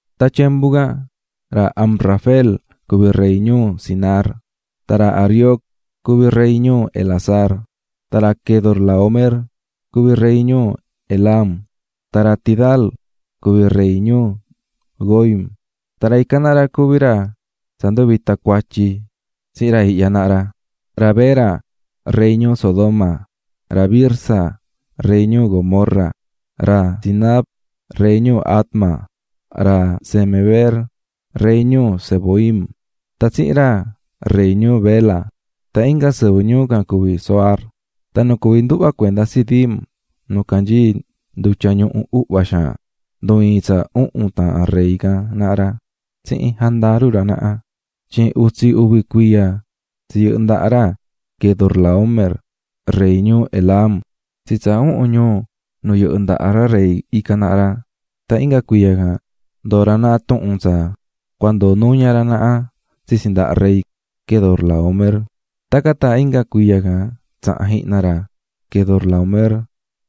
Tan tyembu can ra Amrafel cuví rey ñuu Sinar, tan ra Arioc cuví rey ñuu Elasar, tan ra Quedorlaómer cuví rey ñuu Elam, tan ra Tidal cuví rey ñuu Goim. Tan ra ican naha ra cuví ra tsa nduvita̱ cuatyi tsihin ra ihya naha ra: ra Bera, rey ñuu Sodoma, ra Birsa, rey ñuu Gomorra, ra Sinab, rey ñuu Adma, ra Semeber, rey ñuu Zeboim, tan tsihin ra rey ñuu Bela, tan inga sɨvɨ ñuu can cuví Zoar. Tan nu cuví nduhva cuenda Sidim nu canyií Ndutya Ñuhu Uhva Xaan, ndu̱ iin tsa uhun taahan ra rey can naha ra tsihin jandaru ra naha. Tyin utsi uvi cuiya tsi yɨhɨ̱ ndaha ra Quedorlaómer rey ñuu Elam tsi tsa uhun ñuu nu yɨhɨ́ ndaha ra rey ican naha ra, tan inga cuiya can ndoo̱ ra naha tuhun tsa cua ndoo nuña ra naha tsitsi ndaha rey Quedorlaómer. Tacan tan inga cuiya can tsaha̱n jihna ra Quedorlaómer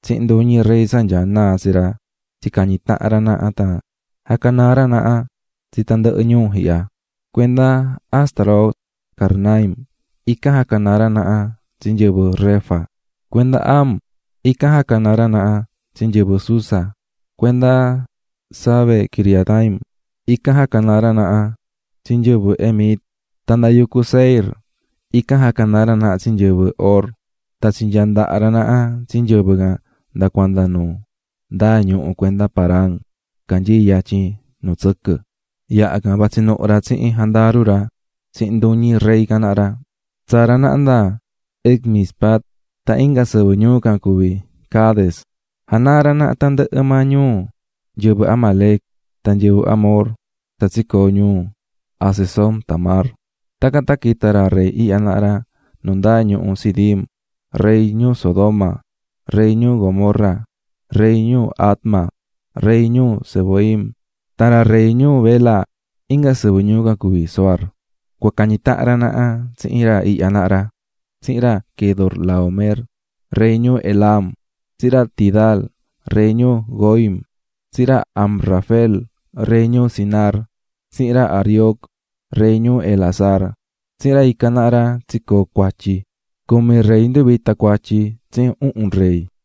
tsihin nduñi rey tsa nyaá naa tsi ra tsicañi̱ tahan ra naha tan jacanaa̱ ra naha tsi tandɨhɨ ñuu ihya: cuenda Astarot Karnaim, ican jacanaa̱ ra naha tsi nyɨvɨ Refa, cuenda Ham, ican jacanaa̱ ra naha tsi nyɨvɨ Zuza, cuenda Save-quiriataim, ican jacanaa̱ ra naha tsi nyɨvɨ Emit. Tan nda yucu Seir, ican jacanaa̱ ra naha tsi nyɨvɨ Hor tan tsinyaa ndaha̱ ra naha tsi nyɨvɨ can nda cuanda nu ndaa ñuhu cuenda Parán, canyií yatyin nu tsɨquɨ. Yaha can, vatsi nuhu ra tsihin jandaru ra tsihin nduñi rey can naha ra, tsaa̱ ra naha nda En-mispat tan inga sɨvɨ ñuu can cuví Cades. Janaa̱ ra naha tandɨhɨ maa ñuu nyɨvɨ Amalec tan nyɨvɨ Amor tsa tsicoo̱ ñuu Hazezon-tamar. Tacan tan quita̱ ra rey ihya naha ra nu ndaa ñuhu Sidim: rey ñuu Sodoma, rey ñuu Gomorra, rey ñuu Adma, ra rey ñuu Zeboim, tan ra rey ñuu Bela (inga sɨvɨ ñuu can cuví Zoar) cua cañi tahan ra naha tsihin ra ihya naha ra: Tsihin ra Quedorlaómer, rey ñuu Elam, tsihin ra Tidal, rey ñuu Goim, tsihin ra Amrafel, rey ñuu Sinar, tsihin ra Arioc, rey ñuu Elasar. Tsihin ra ican naha ra tsicoo̱ cuatyi can. Cumi rey nduvita̱ cuatyi tsihin uhun rey.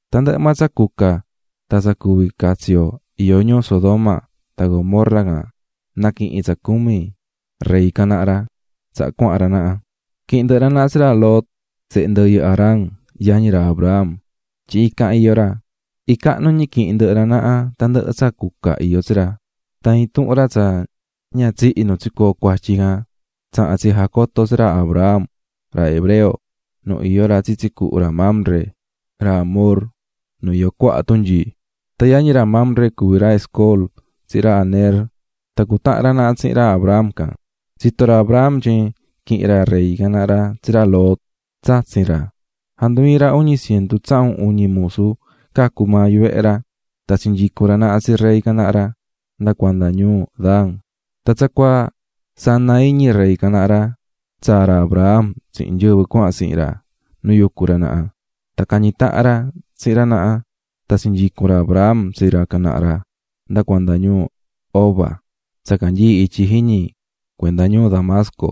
Tandɨhɨ maa tsa cuca tan tsa cuví catsi yo iyó ñuu Sodoma tan Gomorra can naquihi̱n tsa cumi rey can naha ra tsaha cuahan ra naha. Quihi̱n ndɨhɨ ra naha tsi ra Lot, sehe ndɨyɨ Harán, yañi ra Abram, tyin ican iyó ra. Icahnu ñi quihi̱n ndɨhɨ ra naha tandɨhɨ tsa cuca iyó tsi ra. Tan intuhun ra tsa ña tsihi̱ nu tsicoo̱ cuatyi can tsaha̱n ra tsijacoto̱ ra tsi ra Abram, ra hebreo, nu iyó ra tsitsi cuhu ra Mamre, ra Amor, nu iyó cuaha tunyii. Tan yañi ra Mamre cuví ra Escol tsihin ra Aner, tan cutahán ra naha tsihin ra Abram can. Tsito̱ ra Abram tyin quihi̱n ra rey can naha ra tsi ra Lot, tsatsin ra, jandu ii̱n ra uñi cientu tsahun uñi musu cacu̱ maa yuvehe ra, tan tsinyicu̱n ra naha tsi ra rey can naha ra nda cuanda ñuu Dan. Tan tsacuaa sana iñi ra rey can naha ra, tsaa̱ ra Abram tsihin nyɨvɨ cuahan tsihin ra nu yucú ra naha, tan cañi̱ tahan ra tsihin ra naha, tan tsinyicu̱n ra Abram tsi ra can naha ra nda cuanda ñuu Hoba, tsa canyií ityi jiñi cuenda ñuu Damasco.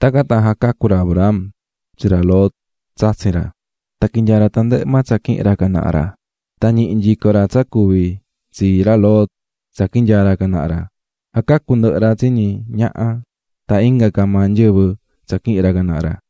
Tacan tan jacacu̱ ra Abram tsi ra Lot, tsatsin ra, tan quinyaa̱ ra tandɨhɨ maa tsa quihi̱n ra can naha ra, tan ñihi̱ nyico ra tsa cuví tsii ra Lot tsa quinyaa̱ ra can naha ra, jacacu̱ ndɨhɨ ra tsi ñi ñaha tan inga ca maa nyɨvɨ tsa quihi̱n ra can naha ra.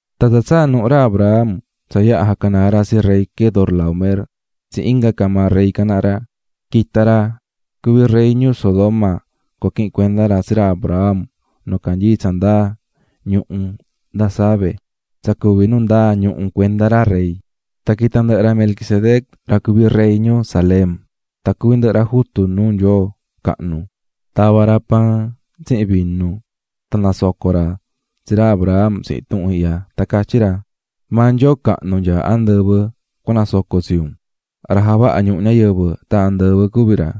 Tan tsa tsaa̱ nuhu ra Abram tsa yaha jacanaa̱ ra tsi rey Quedorlaómer tsihin inga ca maa ra rey can naha ra, quita̱ ra cuví rey ñuu Sodoma cua quihin cuenda ra tsi ra Abram nu canyií tsa ndaa ñuhu nda Save, tsa cuví nu ndaa ñuhu cuenda ra Rey. Tan quita̱ ndɨhɨ ra Melquisedec ra cuví rey ñuu Salem, tan juvin ñi cuví ra jutu nuu Nyoo cahnu, tava̱ ra paan tsihin vinu. Tan nasoco̱ ra tsi ra Abram tsihin tuhun ihya, tan catyí ra: "Maa Nyoo cahnu nyaá andɨvɨ cua nasoco tsi un. Ra javaha̱ ñuhu ñayɨvɨ tan andɨvɨ cuví ra.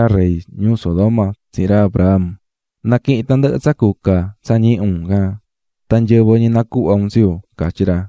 Tacan tan catyí ra rey ñuu Sodoma tsihin ra Abram: --Ndoo maa tandɨhɨ tsa cuca ihya tsi un, nyɨvɨ ñi nacuhva un tsi yu --catyí ra.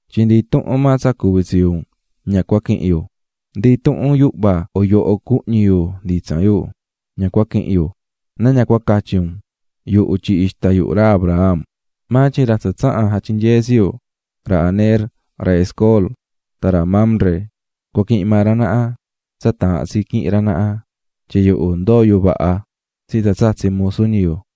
tyin ndi intuhun maa ndaha tyiñu un ña cua quihin yu, ndi intuhun yuhva a yoho cunuhñi nditsan yu ña cua quihin yu; na ña catyi un: "Yuhu tyihi̱ ixta yuhu ra Abraham." Maa tyin ra tsa tsaha̱n jatyinyee̱ tsi yu, ra Aner, ra Escol tan ra Mamre cua quihin maa ra naha tsa taahán tsi quihin ra naha, tyin yuhu ndoó yu vaha tsihin tsa tsatsi̱ musu ñi yu.